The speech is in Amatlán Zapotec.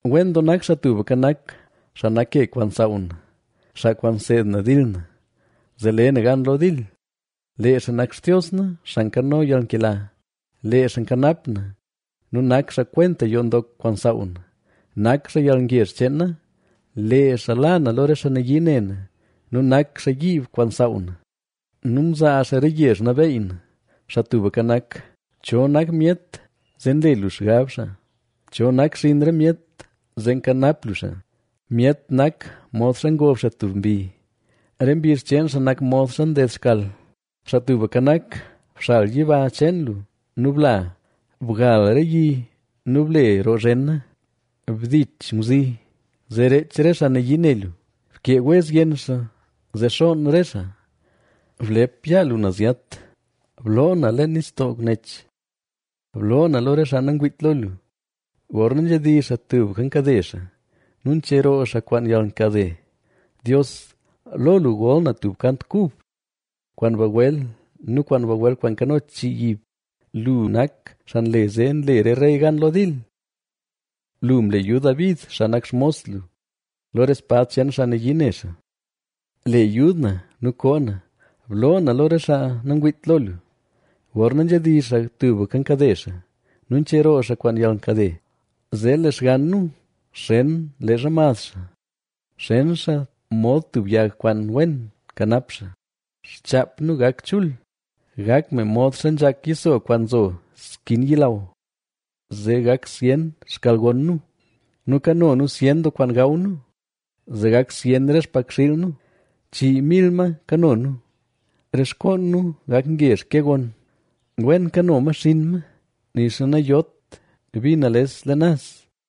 Wen doo nak Xaa Tubka Nak, xaa nak ke kwaan nsaaw na, xaa kwaan nseed na dil na, zee le na gan lo dil. Lee xaa nak Xtios na, xaa nkano yalnkela; lee xaa nkanap na nu nak xaa kwenta yoo ndok kwaan nsaaw na; nak xaa yalngezh cheen na; lee xaa la na lo re xaa nayii ne na nu nak xaa yiib kwaan nsaaw na nu mzaa xaa re yezh nabeey na. Xaa Tubka Nak, ¿cho nak myet zee nle lu xgab xaa? ¿Cho nak xinn re myet zee nkanap lu xaa? Myet nak modxa ngob xaa tub mbi; re mbizh cheen xaa nak modxa nded xkal. Xaa Tubka Nak, bxal yiba cheen lu nu bla; bgal re yi nu ble roo zhena. Bdich ngwzi, zee reech re xaa nayii ne lu, bkee wez yenn xaa, zee xoon re xaa. Blep yaa lu naz yat; bloo na leen nistoo nech, bloo na lo re xaa nangwiit lo lu. Gorna nzhedizh xaa tubka nkade xaa; nu ncheroo xaa kwaan yalnkade. Dios, lo lu gol na tub kant kub; kwaan bagwel nu bagwel kwaan nkano chii yiib. Lu nak xaa nle zee nle re rey gan lo dil; lu mle yud David, xaa nak xmos lu, lo re spad cheen xaa nayii ne xaa. Le yud na nu koo na, bloo na lo re xaa nangwiit lo lu. Gorna nzhedizh xaa tubka nkade xaa; nu ncheroo xaa kwaan yalnkade. Zee lee xgann nu xen leezha mad xaa, xen xaa mod tub yag kwaan wen nkanap xaa; xchaap nu gak chul, gak me modxa nzhak yiso kwaan nzo skin yilaw. Zee gak zyen xkalgon nu, nu kano nu zyen doo kwaan gaw nu; zee gak zyen re xmbakxiil nu, chii mil ma kano nu. Re xkoon nu gak ngezh ke gon; wen kano ma xinn ma, nixa nayot bi nales leen naz.